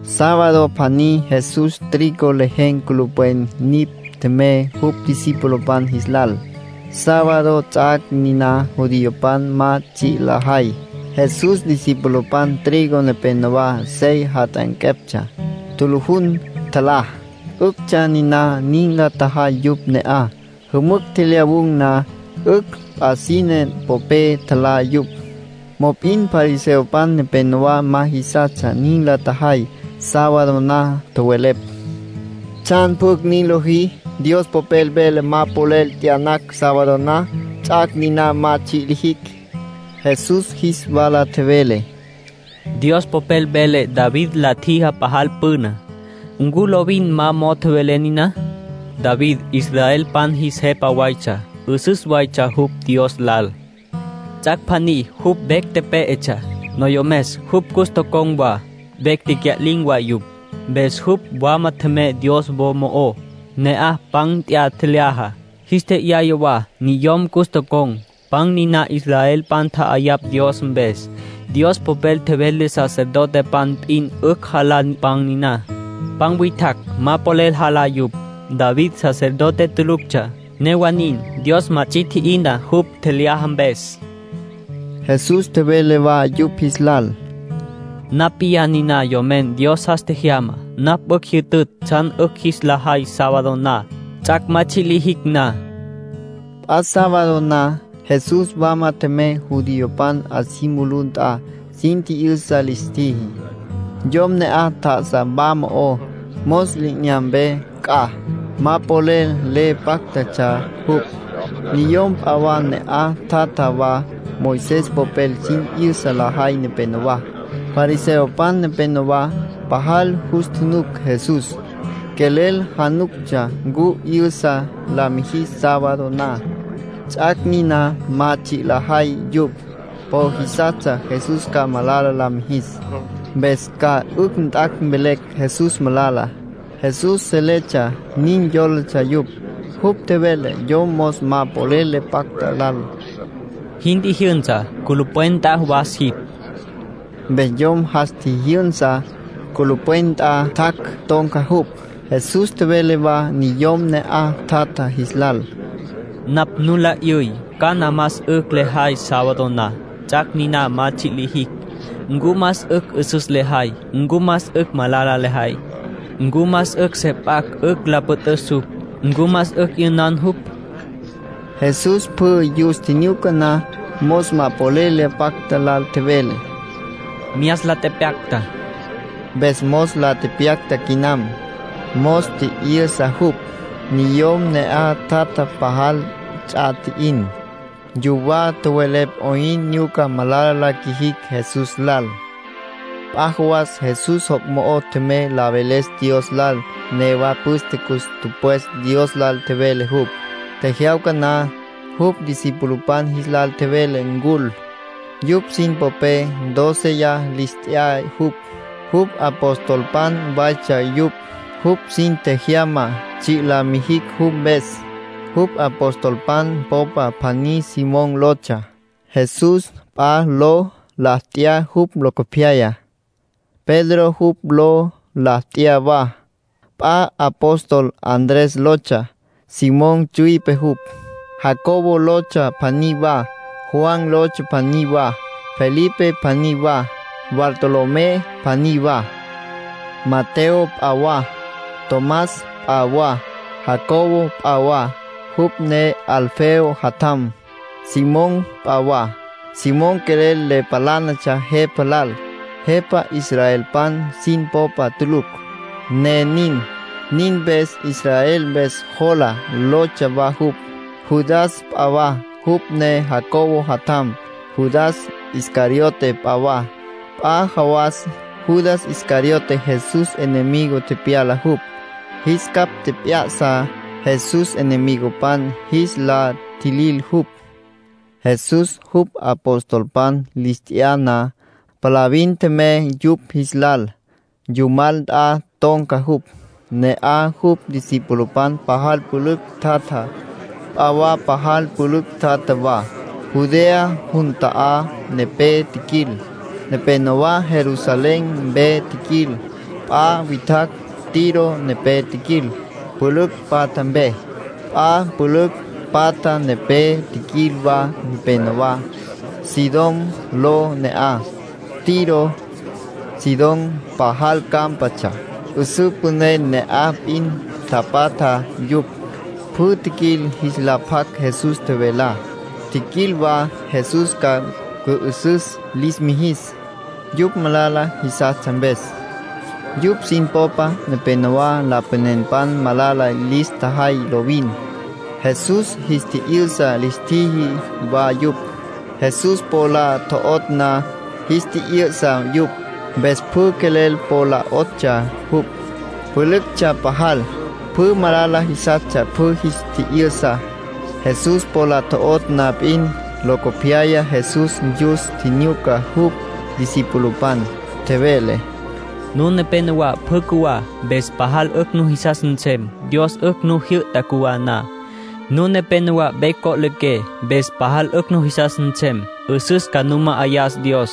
Sábado pjaní Jesús trigo lejen̈ culupwen nipj tjemey jupj discipulopan jis lal. Sábado ts'ac' niná judiopan ma tsji' lajay. Jesús discipulopan trigo nepénowa sey jat'anqueptsja, tjulujun, tjalá. ('Üctsja niná nin la tjajay yupj ne'aj. Jümücj tjelyawun̈ na, 'ücj p'a sine popé tjalá yupj.) Mop'in fariseopan nepénowa ma jisastsja nin la tjajay sábado na. Tjowelepj: —¿Tsjan pjucj nin lojí? Dios Popel vele ma polel t'yanacj sábado na, ts'ac' niná ma tsji' lijicj. Jesús jis wala tjevele: —Dios Popel vele David la tjijá pajal püna. ¿Ncu lovin ma mo'o tjowelé niná? (David israelpan jis jepa waytsja. 'Üsüstsja jupj Dios lal.) Ts'ac' pjaní jupj vecj pé'etsja. Noyomes jupj cus tocon̈ wa, vecj tecya'lin̈ wa yupj. Mpes jupj wama tjemey Dios wo mo'ó; ne'aj pan nt'ya, tjelyaja. Jis tje'yaya wa niyom cus tocon̈. Pan niná israelpan tja'ayapj Dios mpes. Dios Popel tjevele sacerdotepan p'in 'ücj jalá pan niná. P'a witjacj ma polel jalá yupj. David sacerdote tuluctsja; newa nin Dios ma ts'i tji'ina jupj tjelyaja mpes. Jesús tjevele wa yupj jis lal: —Napj p'iyá niná Yomen Dios jas tjejyamá. Napj 'ücj jyütütj tsjan 'ücj jis la jay sábado na, ts'ac' ma tsji' lijicj na. P'a sábado na, Jesús wama tjemey judiopan 'a si mulú nt'a. Sin tji'yüsa lis tjiji. Yom ne'aj tjá'asa wa mo'ó, mos li'inyampe c'a. Ma polel le páctatsja jupj. Niyom p'a wa ne'aj tjatja wa, Moisés popel sin 'yüsa lajay nepenowá, fariseopan nepenowá. Pajal jus tjunuc Jesús, quelel januctsja ncu 'yü'sa la mijis sábado na, ts'ac' niná ma tsji' lajay yupj. Po jisastsja Jesús ca malala la mijis, mpes ca 'ücj jat' mvelecj Jesús malala. Jesús seletsja nin yólatsja yupj. Jupj tjevele yom mos ma polel le pacta lal: —Jin tjijyünsa. Culupwen nt'a was jipj. Mpes yom jas tjijyünsa, culupwen nt'a tjac', ton̈ca jupj. Jesús tjevele wa niyom ne'aj tjatja jis lal: —Napj nu la 'yüy cana más 'ücj lejay sábado na, ts'ac' niná ma tsji' lijicj. ¿Ncu más 'ücj 'üsüs lejay, ncu más 'ücj malala lejay? ¿Ncu más 'ücj se p'acj 'ücj la püt'üs jupj, ncu más 'ücj 'yünan jupj? Jesús pjü yus tjinyuca na, mos ma polel le pacta lal tjevele: —Myas la tepyacta. Mpes mos la tepyacta quinam. Mos tji'yü'sa jupj. Niyom ne'aj tjatjá pajal ts'a tji'in. Yuwá tjowelepj 'oyn nyuca malala la qjuijicj Jesús lal. P'a jawas Jesús joc' mo'o tjemey la veles Dios lal. Newa püste cus tüpwes Dios lal tjevele jupj. Tjejyawca na, jupj discipulopan jis lal tjevele ncul. Yupj sin popé dóceya lis t'ya jupj. Jupj apostolpan waytsja yupj; jupj sin tjejyama tsji' la mijicj jupj mpes. Jupj apostolpan popa pjaní Simón lotsja. Jesús p'a ló la t'ya jupj locopyaya. Pedro jupj ló la t'ya wa. P'a apóstol Andrés lotsja, Simón tsüipe jupj. Jacobo lotsja pjaní wa. Juan lotsja pjaní wa. Felipe pjaní wa, Bartolomé pjaní wa. Mateo p'a wa, Tomás p'a wa, Jacobo p'a wa, jupj ne Alfeo jatjam. Simón p'a wa. Simón quelel le palánatsja jepa lal, jepa israelpan sin popa tulucj, ne nin. Nin mpes “Israel Mpes Jola” lotsja wa jupj. Judas p'a wa, jupj ne Jacobo jatjam. Judas Iscariote p'a wa. P'a jawas Judas Iscariote Jesús enemigo tepyala jupj. Jis capj tjep'ya'sa Jesús enemigopan jis la tjilil jupj. Jesús jupj apostolpan lis t'ya na, palavin tjemey yupj jis lal. Yumal nt'a ton̈ca jupj. Ne'aj jupj discipulopan pajal pülücj tjatja. P'a wa pajal pülücj tjatja wa. Judea jun ta'á nepé tjiquil, nepénowa Jerusalén mpe tjiquil. P'a witjacj Tiro nepé tjiquil, pülücj patja mpe. P'a pülücj patja nepé tjiquil wa nepenowá, Sidón ló ne'aj. Tiro, Sidón, pajal cámpatsja. 'Üsǘ püné ne'aj p'in tapatja yupj. Pjü tjiquil jis la pjac Jesús tjevelá. Tjiquil wa Jesús ca cü'ü'süs lis mijis, yupj malala jisastsja mpes. Yupj sin popa nepenowá lapanenpan malala lis tjajay lovin. Jesús jis tji'yü'sa lis tjiji wa yupj. Jesús po la tjo'otj na, jis tji'yü'sa yupj. Mpes pjü quelel po la 'otsja jupj, pülüctsja pajal. Pjü malala jisas pjü jis tji'yü'sa, Jesús po la tjo'otj na p'in. Locopyaya Jesús yus tjinyuca jupj discipulopan, tjevele: “Nun nepénowa pjü cjuwá, mpes pajal 'ücj nujisas nsem. Dios 'ücj nu jyü'ta cjuwá na. Nun nepénowa vecj co'liqué, mpes pajal 'ücj nujisas nsem. 'Üsüs ca nu ma'ayas Dios.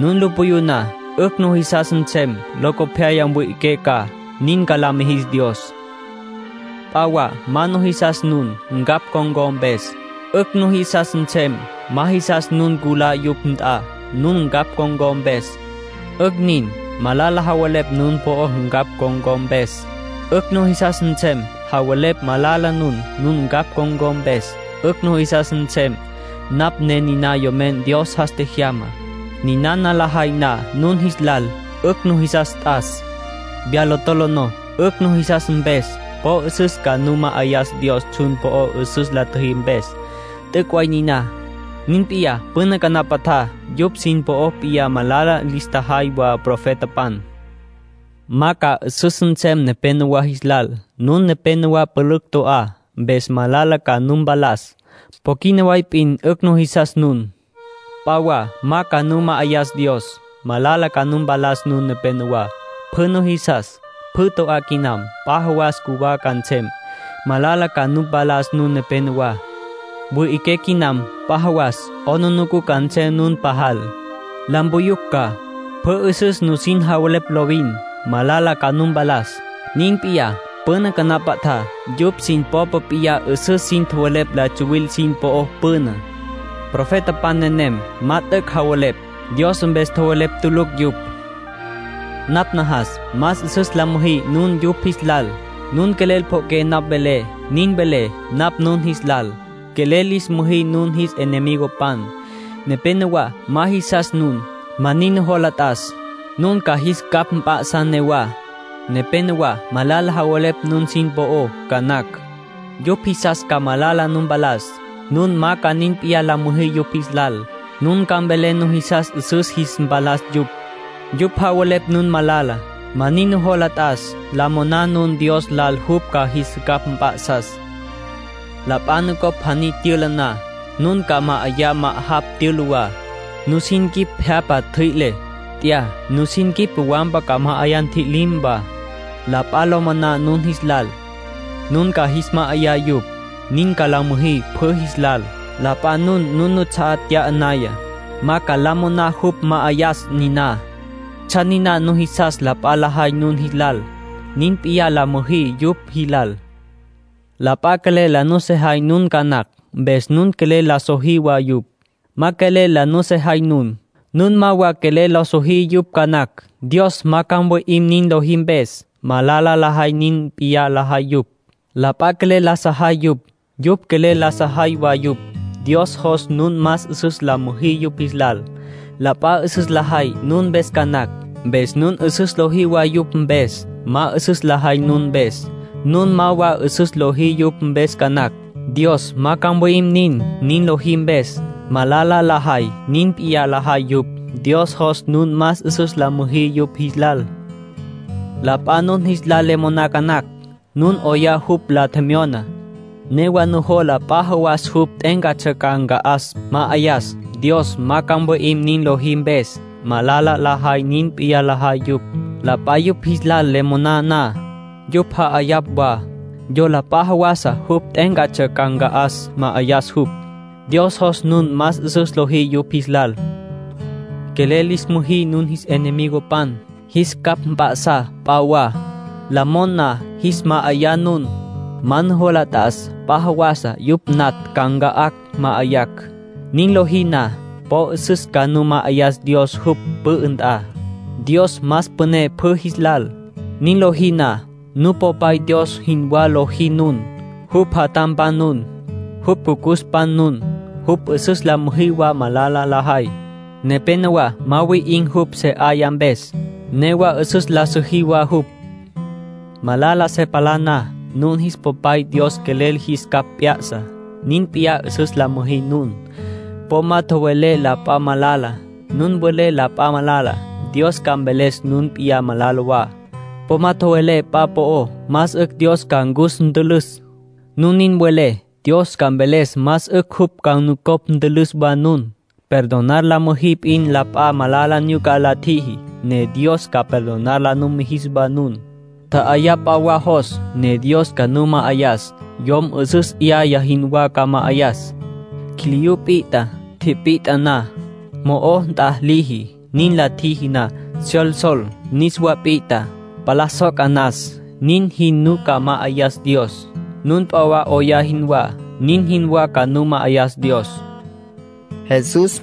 Nun lu puyú na, 'ücj nujisas nsem. Locopyaya mwi'iqué ca. (Nin ca la mijis Dios.) P'a wa ma jisas nun, ncapj con̈có mpes, 'ücj nujisas nsem. Ma jisas nun culá yupj nt'a, nun ncapj con̈có mpes, 'ücj nin. Malala javelepj nun po'ó ncapj con̈có mpes, 'ücj nujisas nsem. Javelepj malala nun, nun ncapj con̈có mpes, 'ücj nujisas nsem. Napj ne niná Yomen Dios jas tjejyamá. ”Ninana lajay na nun jis lal, 'ücj nujisas t'as. Viyá lo tolonó 'ücj nujisas mpes. Po 'üsüs ca nu ma'ayas Dios tsjun po'ó 'üsüs la tjüjí mpes. T'üc' way niná. Nin p'iyá püna canapatjá yupj sin popa p'iyá malala lis tjajay wa profetapan. ”Ma ca 'üsüs nsem nepénowa jis lal. Nun nepénowa pülücj to'á. Mpes malala ca nu mpalas. Po quina way p'in 'ücj nujisas nun. P'a wa ma ca nu ma'ayas Dios. Malala ca nu mpalas nun nepenowá. Pjü nujisas, pjü to'á quinam. P'a jawas cjuwá ca nsem. Malala ca nu mpalas nun nepénowa. Wüi'iqué quinam. P'a jawas 'aplijila ca nsem nun pajal. La mpuyucj ca. Pjü 'üsüs nusin javelepj lovin, malala ca nu mpalas. Nin p'iyá püna canapatjá yupj sin popa p'iyá 'üsüs sin tjowelepj la tsuwilpan sin po'ó püná. Profetapan nenem ma t'üc' tjowelepj. Dios mpes tjowelepj tulucj yupj. ”Napj najas más 'üsüs la müjí nun yupj jis lal. Nun quelel pjo'oqué napj velé, nin velé napj nun jis lal: quelel lis müjí nun jis enemigopan. Nepénowa ma jisas nun, ma nin nujola t'as. Nun ca jis capj mp'a'sá newá. Nepénowa malala javelepj nun sin po'ó ca nacj, yupj jisas ca malala nu mpalas. Nun ma ca nin p'iyá la müjí yupj jis lal. Nun ca mvelé nujisas 'üsüs ca jis mpalas yupj. Yupj javelepj nun malala, ma nin nujola t'as. La moná nun Dios lal jupj ca jis capj mp'a'sas. ”La p'a nupjocj pjaní tyüla na, nun ca ma'ayá ma'ajapj tyüla wa. Nusin quip pje'apa tjüi'le, t'ya, nusin quip wampa ca ma'ayá ntji'lim wa. La p'a la mon na nun jis lal, nun ca jis ma'ayá yupj. Nin ca la müjí pjü jis lal. La p'a nun nuts'a'á nt'ya naya, ma ca la moná jupj ma'ayas niná. ”Tsjan niná nujisas la p'a lajay nun jis lal, nin p'iyá la müjí yupj jis lal. La p'a quelel la nusejay nun ca nacj, mpes nun quelel la sojí wa yupj. Ma quelel la nusejay nun, nun ma wa quelel la sojí yupj ca nacj. Dios ma ca mwi'im nin lojí mpes. Malala lajay nin p'iyá lajay yupj. La p'a quelel la sajay yupj, yupj quelel la sajay wa yupj. Dios jos nun más 'üsüs la müjí yupj jis lal. La p'a 'üsüs lajay nun mpes ca nacj, mpes nun 'üsüs lojí wa yupj mpes. Ma 'üsüs lajay nun mpes, nun ma wa 'üsüs lojí yupj mpes ca nacj. Dios ma ca mwi'im nin nin lojí mpes. Malala lajay nin p'iyá lajay yupj. Dios jos nun más 'üsüs la müjí yupj jis lal. La p'a nun jis lal le moná ca nacj. Nun 'oyá jupj la tjemyona, newa nujola p'a jawasa jupj t'e'éncatsja ca nca'as, ma'ayas. Dios ma ca mwi'im nin lojí mpes. Malala lajay nin p'iyá lajay yupj. La p'a yupj jis lal le monana, yupj ja'ayapj wa. Yola p'a jawasa jupj t'e'éncatsja ca nca'as, ma'ayas jupj. Dios jos nun más 'üsüs lojí yupj jis lal. ”Quelel lis müjí nun jis enemigopan. Jis capj mp'a'sá p'a wa. La mon na, jis ma'ayá nun. Ma nujola t'as p'a jawasa yupj natj ca nca'acj, ma'ayacj. Nin lojí na, po 'üsüs ca nu ma'ayas Dios jupj pü'ü nt'a. Dios más püné pjü jis lal. Nin lojí na, Nupopay Dios jinwá lojí nun. Jupj jatjampan nun, jupj jucucuspan nun. Jupj 'üsüs la siji wa malala lajay. Nepénowa ma wi'in̈ jupj se 'aya mpes, newa 'üsüs la siji wa jupj. Malala se palá na, nun jis Papay Dios quelel jis capj p'ya'sa. Nin p'iyá 'üsüs la müjí nun. ”Po ma tjowelé la p'a malala. Nun welé la p'a malala, Dios ca mveles nun p'in malala wa. Po ma tjowelé p'a po'ó más 'ücj Dios ca cus ntülüs. Nun nin welé, Dios ca mveles más 'ücj jupj ca nucopj ntülüs wa nun. Perdonar la müjí p'in la p'a malala nyuca la tjiji, ne Dios ca perdonar la numijis wa nun. ”Tja'ayá p'a wa jos, ne Dios ca nu ma'ayas. Yom 'üsüs 'yaya jinwá ca ma'ayas. Quiliyú pit'a. Tipit'a na, mo'o t'a liji. Nin la tjiji na, syolsol, niswa pit'a, palá soca nas. Nin jin ca nu ma'ayas Dios. Nun p'a wa 'oyá jinwá, nin jinwá ca nu ma'ayas Dios”, nin tjevele Jesús.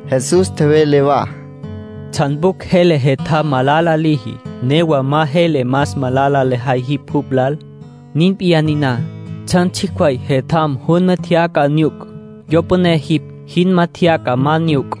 Jesús tjevele wa: “¿Tsjan pjucj jele jetjam malala liji, newa ma jele más malala lejay jipj jupj lal? Nin p'iyá niná, tsjan tsjicj way jetjam junma tjeyaca nyuc; yo püné jipj jinma tjeyaca ma nyuc.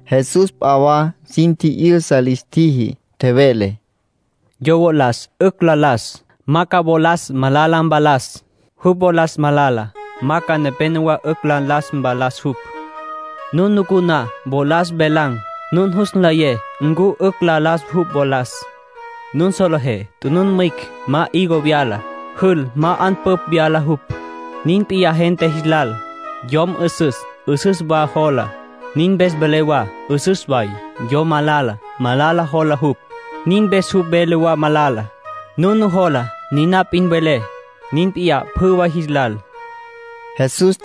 Jesús p'a wa sin tji'yüsa lis tjiji. Tjevele: “Yo wolas 'ücj la las, ma ca wolas malala mvalas. Jupj wolas malala, ma ca nepénowa 'ücj la las mvalas jupj. Nun nucú na wolas velan̈, nun jus nlayé ncu 'ücj la las jupj wolas. Nun solejé tunun mwicj ma higo vyala. Jül ma 'anpüpj vyala jupj. Nin p'iyá gente jis lal. Yom 'üsüs, 'üsüs wa jola. Nin mpes vele wa 'üsüs way. Yom malala, malala jola jupj. Nin mpes jupj vele wa malala. Nun nujola, niná p'in welé. Nin p'iyá pjü way jis lal”, nin tjevele Jesús.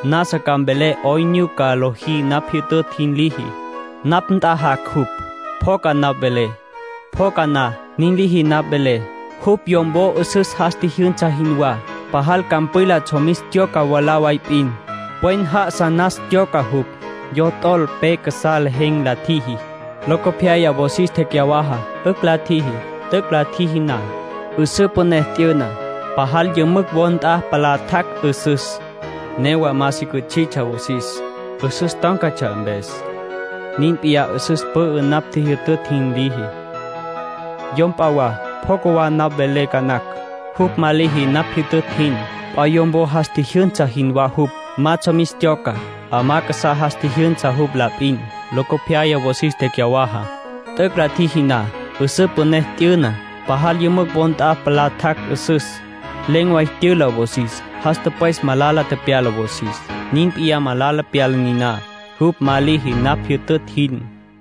Nasa ca mvelé 'oyn nyuca liji napj jyütütj jin liji. Napj nt'a jac' jupj, pjoca napj velé. Pjoca na, nin liji napj vele. Jupj yom wo 'üsüs jas tjijyünsa jinwá. Pajal campwila tsjomis tyoca mwalá way p'in, pwen já'asa nas tyoca jupj. Yo t'ol pe casá lejen̈ la tjiji. Locopyaya wosis tjecyawaja, 'ücj la tjiji. T'üc' la tjiji na, 'üsǘ püné t'yüna, pajal yümücj wo nt'a palá tjac' 'üsüs. Newa ma si cüts'itsja wosis, 'üsüs tón̈catsja mpes. Nin p'iyá 'üsüs pü'ü napj jyütütj jin liji. ”Yom p'a wa pjoca wa napj velé ca nacj, jupj ma liji napj jyütütj jin. P'a yom wo jas tjijyünsa jinwá jupj. Ma tsjomis tyoca. 'Amá casá jas tjijyünsa jupj la p'in. Locopyaya wosis tecyawaja. T'üc' la tjiji na, 'üsǘ püné t'yüna, pajal yümücj wo nt'a palá tjac' 'üsüs. Len̈ way tyüla wosis. Jas tüpwes malala tepyala wosis. Nin p'iyá malala pyala niná, jupj ma liji napj jyütütj jin.”